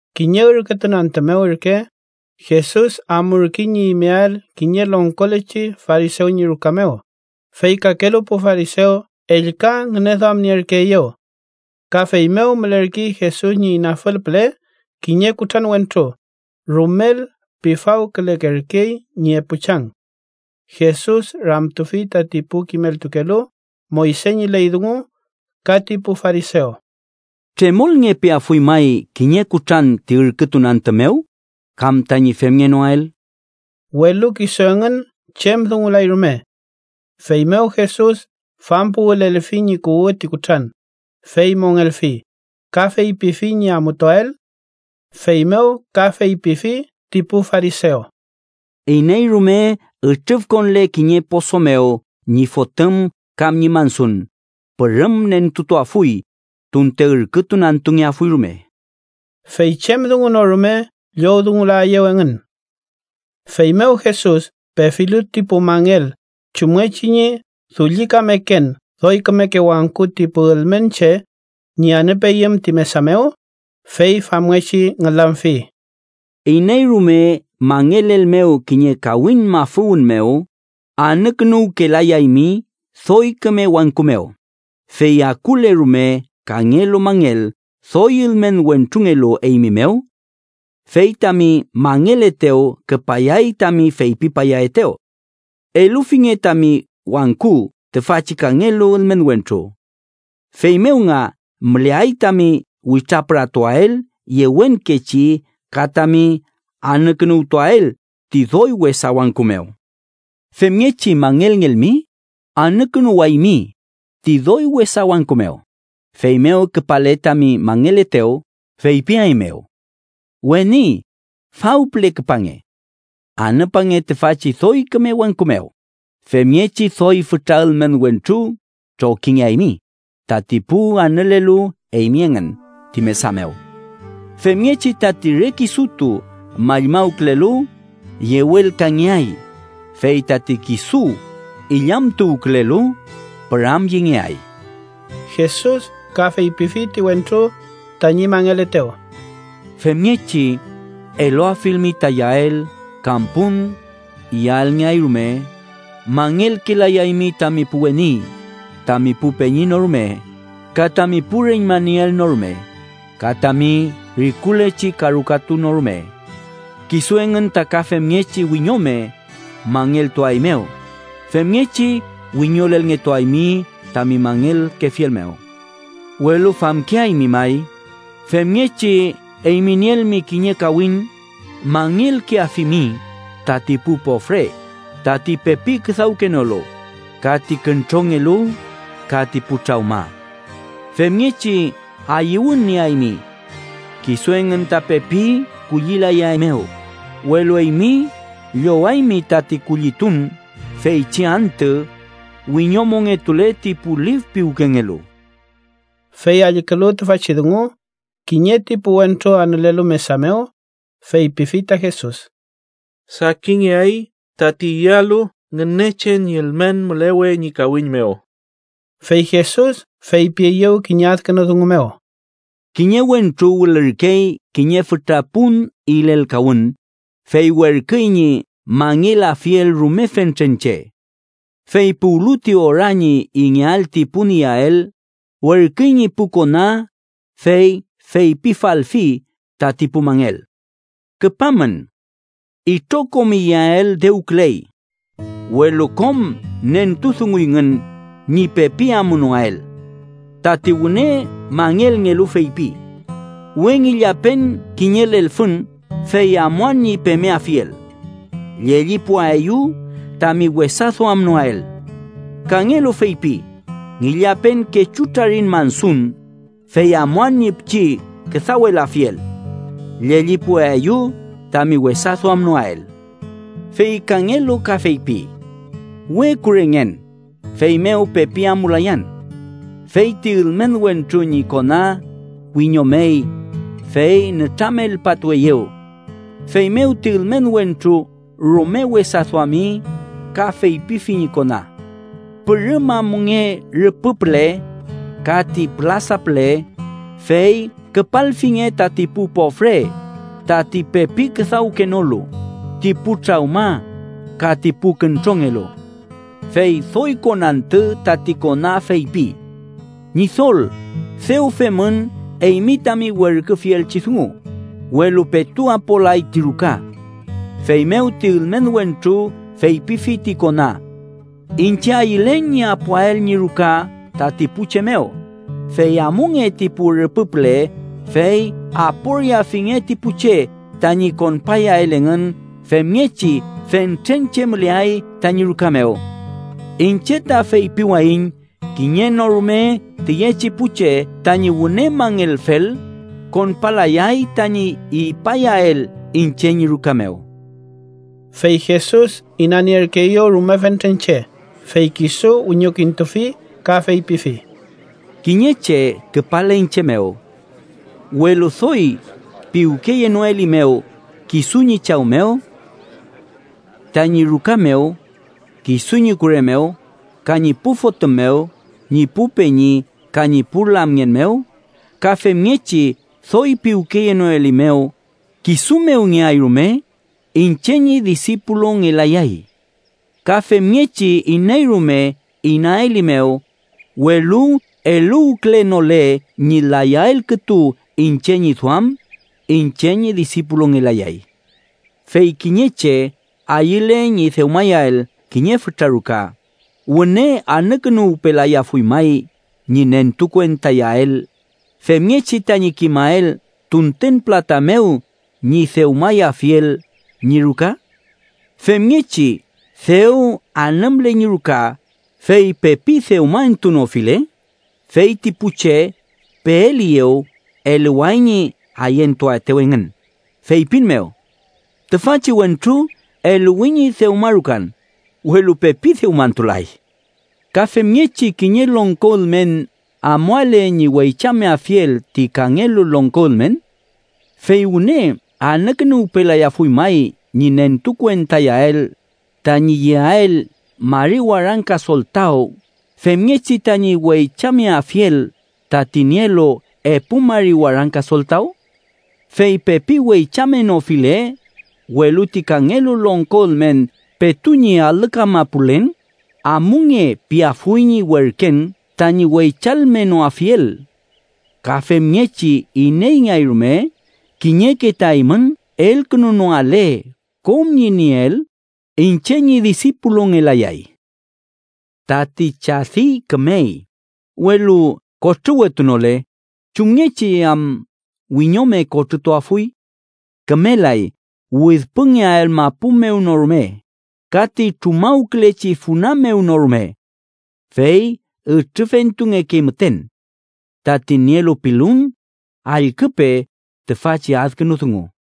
Kiñe ürkütun antü mew ürke, Jesus amurkey ñi imeael kiñe longkolechi farisew ñi ruka mew, fey kakelu pu farisew ellka ngüneduamnierkeeyew. Ka feymew mülerkey Jesus ñi inafül püle kiñe kutran wentru, rumel pifawkülekerkey ñi epu chang. Jesus ramtufi tati pu kimeltukelu Moyse ñi ley dungu ka ti pu farisew: —¿Tremolngepeafuy may kiñe kutran ti ürkütun antü mew kam tañi femngenoael? Welu kisu engün chem dungulay rume. Feymew Jesus fampuwülelfi ñi kuwü ti kutran, fey mongelfi, ka feypifi ñi amutuael. Feymew ka feypifi ti pu farisew: —Iney rume ütrüfkonle kiñe poso mew ñi fotüm kam ñi mansun, pürüm nentutuafuy, tunte ürkütun antüngeafuy rume. Fey chem dungu no rume llowdungulaeyew engün. Feymew Jesus pefilu ti pu mangel chumngechi ñi dullikameken doy kümeke wangku ti pu ülmen che ñi anüpeyüm ti mesa mew, fey famngechi ngülamfi: —Iney rume mangelelmew kiñe kawiñ mafüwün mew, anükünuwkelayaymi doy küme wangku mew, fey akule rume kangelu mangel doy ülmen wentrungelu eymi mew. Fey tami mangeletew küpayay tami feypipayaetew: ‘Elufinge tami wangku tüfachi kangelu ülmen wentru.’ Feymew nga müleay tami witrapüratuael yewenkechi ka tami anükünuwtuael ti doy wesa wangku mew. Femngechi mangelngelmi, anükünuwaymi ti doy wesa wangku mew, feymew küpale tami mangeletew feypiaeymew: ‘Weni, faw püle küpange. Anüpange tüfachi doy küme wangku mew,’ femngechi doy fütra ülmen wentru trokingeaymi tati pu anülelu eymi engün ti mesa mew. Femngechi tati re kisutu mallmawkülelu, yewelkangeay. Fey tati kisu illamtuwkülelu, püramyengeay. Jesus ka feypifi ti wentru tañi mangeletew: —Femngechi eluafilmi ta iyael kam pun iyaelngeay rume, mangelkelayaymi tami pu weni, tami pu peñi no rume, ka tami pu reñma nieel no rume, ka tami rikulechi karukatu no rume. Kisu engün ta ka femngechi wiñome mangeltuaeymew, femngechi wiñolelngetuaymi tami mangelkefiel mew. Welu famkeaymi may, femngechi eymi nielmi kiñe kawiñ mangelkeafimi tati pu pofre, tati pepi küdawkenolu, ka ti küntrongelu, ka ti pu trawma. Femngechi ayüwün nieaymi. Kisu engün ta pepi kullilayaeymew, welu eymi llowaymi tati kullitun feychi antü wiñomongetule ti pu lif piwkengelu. Fey allkülu tüfachi dungu, kiñe ti pu wentru anülelu mesa mew, feypifi ta Jesus: —¡Sakinngeay tati iyalu Ngünechen ñi ülmen mülewe ñi kawiñ mew! Fey Jesus feypieyew kiñe adkünu dungu mew: —Kiñe wentru wülürkey kiñe fütra pun ilelkawün, fey werküy ñi mangelafiel rume fentren che. Fey puwlu ti ora ñi ingeael ti pun iyael, werküy ñi pu kona fey feypifalfi tati pu mangel: ‘Küpamün. Itrokom iyael dewküley.’ Welu kom nentudunguyngün ñi pepi amunoael. Tati wüne mangelngelu feypi: ‘We ngillapen kiñe lelfün, fey amuan ñi pemeafiel. Llellipuaeyu tami wesa duamnoael.’ Kangelu feypi: ‘Ngillapen kechu trariñ mansun, fey amuan ñi pichi küdawelafiel. Llellipuaeyu tami wesa duamnoael.’ Fey kangelu ka feypi: ‘We kurengen, feymew pepi amulayan.’ Fey ti ülmen wentru ñi kona wiñomey, fey nütramelpatueyew. Feymew ti ülmen wentru rume wesa duami ka feypifi ñi kona: ‘Pürüm amunge rüpü püle ka ti pülasa püle, fey küpalfinge tati pu pofre, tati pepi küdawkenolu, ti pu trawma ka ti pu küntrongelu.’ Fey doy konantü tati kona feypi: ‘Ñidol, dew femün eymi tami werküfielchi dungu, welu petu apolay ti ruka.’ Feymew ti ülmen wentru feypifi ti kona: ‘Iñche ayülen ñi apoael ñi ruka tati pu che mew, fey amunge ti pu rüpü püle, fey aporiafinge ti pu che tañi konpayael engün, femngechi fentren che müleay tañi ruka mew. Iñche ta feypiwayiñ kiñe no rume tüyechi pu che tañi wüne mangelfel, konpalayay tañi ipayael iñche ñi ruka mew.’ Fey Jesus inanierkeeyew rume fentren che, fey kisu wiñokintufi ka feypifi: “Kiñe che küpale iñche mew, welu doy piwkeyenoelimew kisu ñi chaw mew, tañi ruka mew, kisu ñi kure mew, ka ñi pu fotüm mew, ñi pu peñi ka ñi pu lamngen mew, ka femngechi doy piwkeyenoelimew kisu mew ngeay rume, iñche ñi disipulungelayay. Ka femngechi iney rume inaelimew, welu eluwkülenole ñi layael kütu iñche ñi duam, iñche ñi disipulungelayay. “Fey kiñe che ayüle ñi dewmayael kiñe fütra ruka, ¿wüne anükünuwpelayafuy may ñi nentukuentayael, femngechi tañi kimael tunten pülata mew ñi dewmayafiel ñi ruka? Femngechi dew anümle ñi ruka, fey pepi dewma entuwetunofile, fey ti pu che peeliyew eluway ñi ayentuaetew engün feypin mew: ‘Tüfachi wentru eluwi ñi dewmarukan, welu pepi dewmantulay.’ “Ka femngechi kiñe longko ülmen amuale ñi weychameafiel ti kangelu longko ülmen. ¿Fey wüne anükünuwpelayafuy may ñi nentukuentayael tañi yeael mari warangka soltaw femngechi tañi weychameafiel tati nielu epu mari warangka soltaw? Fey pepi weychamenofile, welu ti kangelu longko ülmen petu ñi alü kamapulen, ‘amunge’ piafuy ñi werken tañi weychalmenoafiel. Ka femngechi, ineyngeay rume kiñeke ta eymün elkünunoale kom ñi nieel, iñche ñi disipulungelayay. “Tati chadi kümey, welu kotrüwetunole, ¿chumngechi am wiñome kotrütuafuy? Kümelay widpüngeael mapu mew no rume ka ti trumawkülechi funa mew no rume. Fey ütrüfentungekey müten. “Tati nielu pilun, allküpe tüfachi adkünu dungu.”